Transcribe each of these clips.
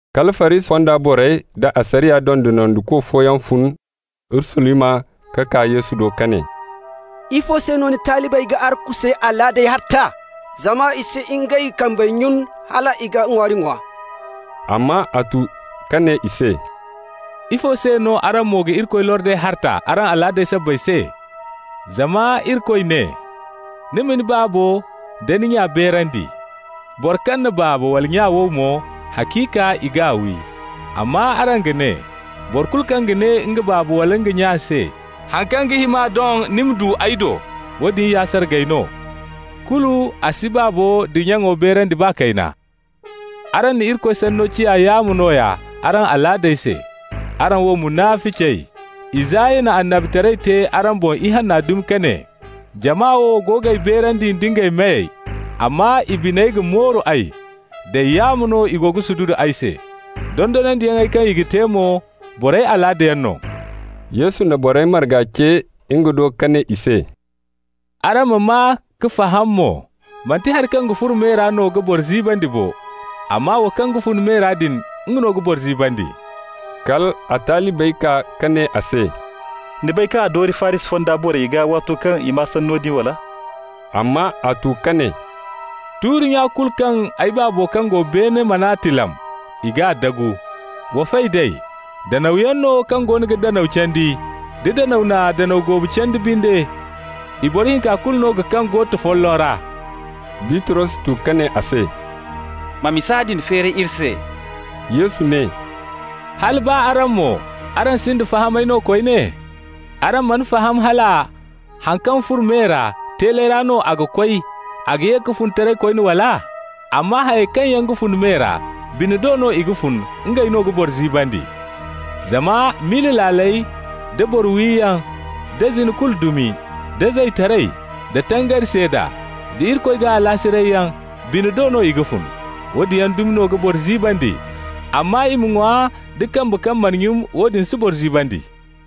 Kala Farisi fonda borey da asariya dondonandiko fooyaŋ fun Urusalima ka kaa Yesu do ka ne: «Ifo se no ni talibey ga arkusey alaadey harta? Zama i si ngey kambey nyun hal i ga ŋwaari ŋwa.» Amma a tu ka ne i se: «Ifo se no araŋ mo ga Irikoy lordey harta araŋ alaadey sabbay se? Zama Irikoy ne: ‹Ni ma ni baabo nda ni nya beerandi. Boro kaŋ na baaba wala nya wow mo, haciika i g'a wi.› Amma araŋ ga ne: ‹Boro kulu kaŋ ga ne nga baaba wala nga nya se: Haŋ kaŋ ga hima doŋ ni ma du ay do, woodin ya sargay no,› kulu a si baabo da nyaŋo beerandi baa kayna. Araŋ na Irikoy sanno ciya yaamo nooya araŋ alaadey se. Araŋ wo munaficey, Isaya na annabitaray te araŋ boŋ ihanna dumi ka ne: ‹Jama wo go g'ay beerandi nda ngey meyey, amma i biney ga mooru ay. Day yaamo no i go ga sududu ay se. Dondonandiyaŋey kaŋ i ga te mo, borey alaadayaŋ no.›» Yesu na borey marga ce nga do ka ne i se: «Araŋ ma maa ka faham mo: Manti hari kaŋ ga furo me ra no ga boro ziibandi bo. Amma wo kaŋ ga fun me ra din, nga no ga boro ziibandi.» Kal a talibey kaa ka ne a se: «Ni bay kaŋ a dooru Farisi fonda borey gaa waato kaŋ i maa sanno din, wala?» Amma a tu ka ne: «Tuuri-nya kulu kaŋ ay Baabo kaŋ go beene mana tilam, i g'a dagu. Wa fay d'ey. Danawyaŋ no kaŋ goono ga danaw candi. Da danaw na danaw goobu candi binde, i boro hinka kulu no ga kaŋ goota folloŋ ra.» Bitros tu ka ne a se: «Ma misa din feeri iri se.» Yesu ne: «Hala baa araŋ mo, araŋ sinda fahamay no koyne? Araŋ mana faham hala haŋ kaŋ furo me ra, teeley ra no a ga koy, a ga ye ka fun taray koyne, wala? Amma hayey kaŋ yaŋ ga fun me ra, bine do no i ga fun, ngey no ga boro ziibandi. Zama miila laaley, da boro wiyaŋ, da zina kulu dumi, da zaytaray, da tangari seeda, da Irikoy gaa alaasirayyaŋ, bine do no i ga fun. Woodin yaŋ dumi no ga boro ziibandi. Amma i ma ŋwa da kambe kaŋ mana nyun, woodin si boro ziibandi.»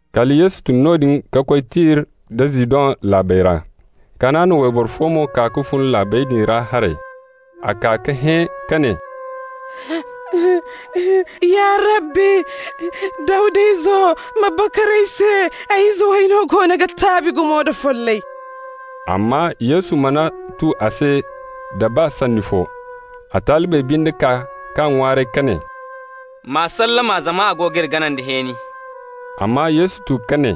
Kala Yesu tun noodin ka koy Tir da Zidon laabey ra. Kanaana wayboro fo mo kaa ka fun laabey din ra haray. A kaa ka hẽ ka ne: «Ya Rabbi, Dawda izo, ma bakar ay se! Ay ize way no goono ga taabi gumo da follay.» Amma Yesu mana tu a se da baa sanni fo. A talibey binde kaa k'a ŋwaaray ka ne: «M'a sallama, zama a go g'iri gana nda hẽeni.» Amma Yesu tu ka ne: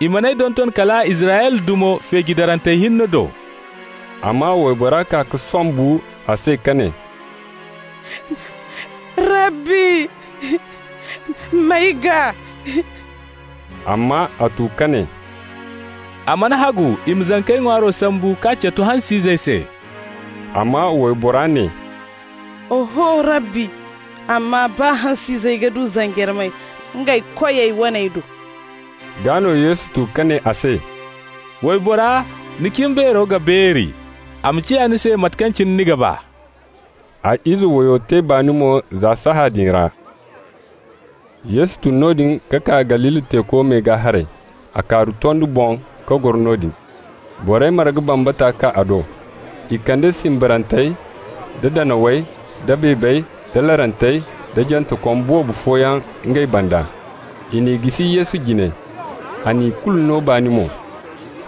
«I man'ay donton kala Israyla dumo feeji darantey hinne do.» Amma waybora kaa ka sombu a se ka ne: «Rabbi, m'ay gaa!» Amma a tu ka ne: «A mana hagu i ma zankey ŋwaaro sambu k'a catu hans'izey se.» Amma waybora ne: «Oho Rabbi, amma baa hans'izey ga du zanjarmey ngey koyey waney do.» Gaa no Yesu tu ka ne a se: «Waybora, ni cimbeero ga beeri. A ma ciya ni se mate kaŋ cine ni ga ba.» A ize wayo te baani mo za saaya din ra. Yesu tun noodin ka kaa Galili teeko me gaa haray. A kaaru tondi boŋ ka goro noodin. Borey marga bambata kaa a do. I kande simbarantey, da danawey, da beebey, da larantey, da jantekom boobo fooyaŋ ngey banda. I n'i jisi Yesu jine, a na ikulu no baani mo.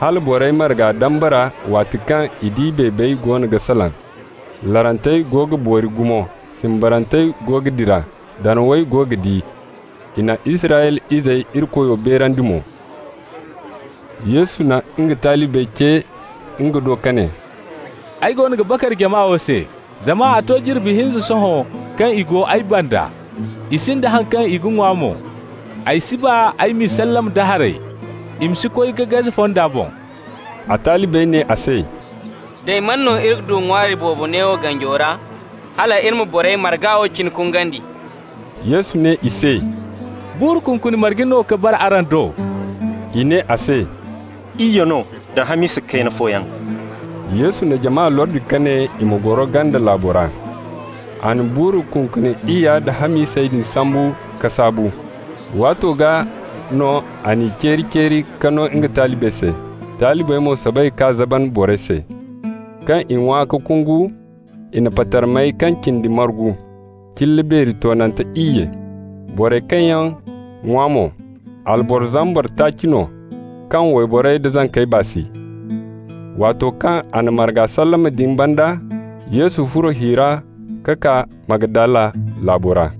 Hala borey marga dambara, waati kaŋ i di beebey goono ga salaŋ, larantey go ga boori gumo, simbarantey go ga dira, danawey go ga di. I na Israyla izey Irikoyo beerandi mo. Yesu na nga talibey ce nga do ka ne: «Ay goono ga bakar jama wo se, zama a to jirbi hinza sohõ kaŋ i go ay banda. I sinda haŋ kaŋ i ga ŋwa mo. Ay si ba ay m'i sallama da haray, i ma si koy ka gaze fonda boŋ.» A talibey ne a se: «Day, man no iri ga du ŋwaari boobo neewo ganjo ra, hal iri ma borey marga wo cine kungandi?» Yesu ne i se: «Buuru kunkuni marge no ka bara araŋ do?» I ne a se: «Iyye no, da hamisa kayna fooyaŋ.» Yesu na jama lordi ka ne i ma goro ganda laabo ra. A na buuru kunkuni iyya da hamisey din sambu ka saabu. Waato gaa no a n'i ceeri-ceeri ka no nga talibey se. Talibey mo soobay ka zaban borey se. Kaŋ i ŋwa ka kungu, i na patarmey kaŋ cindi margu, cilla beeri toonante iyye. Borey kaŋ yaŋ ŋwa mo, alboro zambar taaci no, kaŋ wayborey da zankey baa si. Waato kaŋ a na marga sallama din banda, Yesu furo hi ra ka kaa Magdala laabo ra.